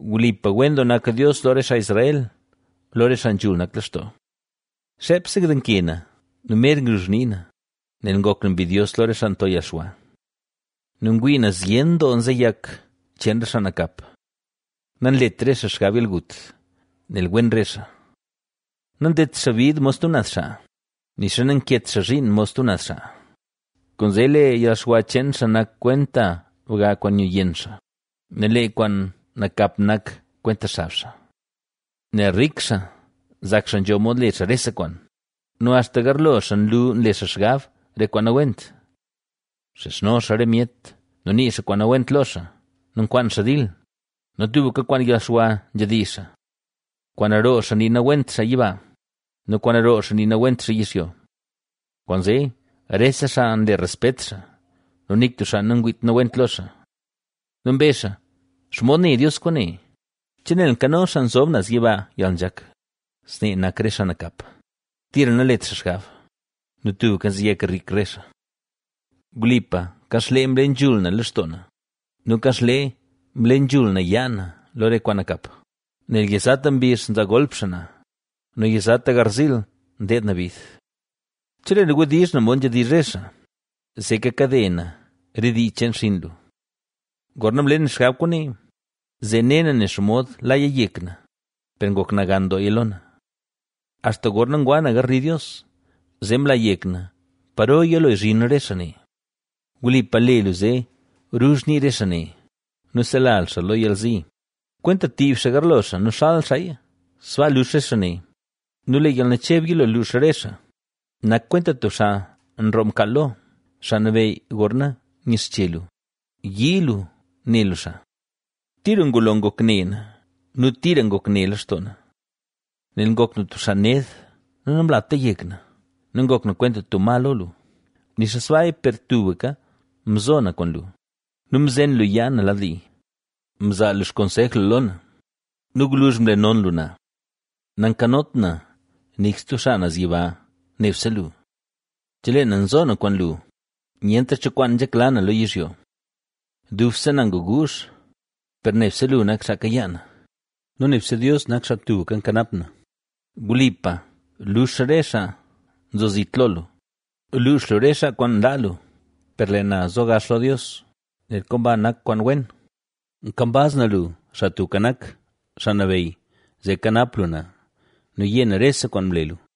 ¡Wlipa, wen doo nak Dios lo re xaa Israel, lo re xaa nzhul nak lextoo! Xeepse ndenke na nu mer ngruzh nii na, nel ngok na mbidyos lo re xaa nto yalxwa nu ngwii na zyen doo nzeyak cheen re xaa nakap. Nanlet re xaa xgab yalgut, nel wen re xaa. Nandedt xaa bid mod stub naz xaa, nixa nanket xaa zhiin mod stub naz xaa, Kwaanzee lee yalxwa cheen xaa nak kwenta bga kwaan nyu yenn xaa nu lee kwaan nakap nak kwenta xab xaa. Nel rik xaa nzak xaa nzho mod le xaa rese kwaan nu axta garlo xaa nlu nle xaa xgab re kwaan nawent. Nxizhno xaa re myet nu nii xaa kwaan nawent lo xaa nu nkwaan xaa dil nu tubka kwaan yalxwa nzhedizh xaa. Kwaan roo xaa nii nawent xaa yiba nu kwaan roo xaa nii nawent xaa yizhyo. Kwaanzee rese xaa nle respet xaa nu nik tub xaa nangwiit nawent lo xaaa. Nu mbezh xaa: “¿Xomod ne Dios kwaane? ¿Che nel nkano Xaa Nzob Naz Yiba yalnzhak?” Snee nak re xaa nakap, tira nanlet xaa xgab nu tubka nzeyak rik re xaa. ¡Wlipa, kanxlee mle nzhul na lextoo na nu kanxlee mle nzhul na yaa na lo re kwaan nakap! Nel yizata mbizh nzaa golp xaa na nu yizata garziil ndeed na bid. Chelee na wdizh na mod nzhedizh re xaa, zee kakade na re dii cheen xinn lu. Gorna mle na xgab kwaane, zee ne na nen xomod laya yek na, per ngok nagan dooya lo na, axta gorna ngwa na garli Dios, zee mla yek na paro yilo zhin re xaa ne. Wlipa, le lu zee ruzh nii re xaa ne nu sela lu xaa lo yalzi. Kwenta ntiib xaa garlo xaa nu xal xaaya, sbaa lux re xaa ne nu lee yalnacheb yilo luux re xaa. Nak kwenta tub xaa nroo mkaal lo, Xaa Nabeyy, gorna nyixche lu, yii lu ne lu xaa. Tira ngulo ngok ne na, nu tira ngok ne lextoo na, nel ngok na tub xaa ned nu namlata yek na; ¡nu ngok na kwenta tub ma lo lu! Nixa sbaaya, per tubka mzo na kwaan lu nu mzen lu yaa na lad li. Mzaa lu xkonsej lu lo na nu gwluzh mle non lu na. Nankanot na nik stub xaa naz yiba, nebse lu. Chelee na nzo na kwaan lu, nyentra cho kwaan nzhekla na lo yizhyo. Dubse na nguguuzh, per nebse lu nak xaa kayaa na nu nebse Dios nak xaa tubka nkanap na. Wlipa, lux re xaa nzo zit lo lu; luux lu re xaa kwaan nlaa lu. Per lee na zo gax lo Dios, nel komba nak kwaan wen. Nkambaz na lu, Xaa Tubka Nak, Xaa Nabeyy, zee kanap lu na nu yé na rese kwaan mle lu.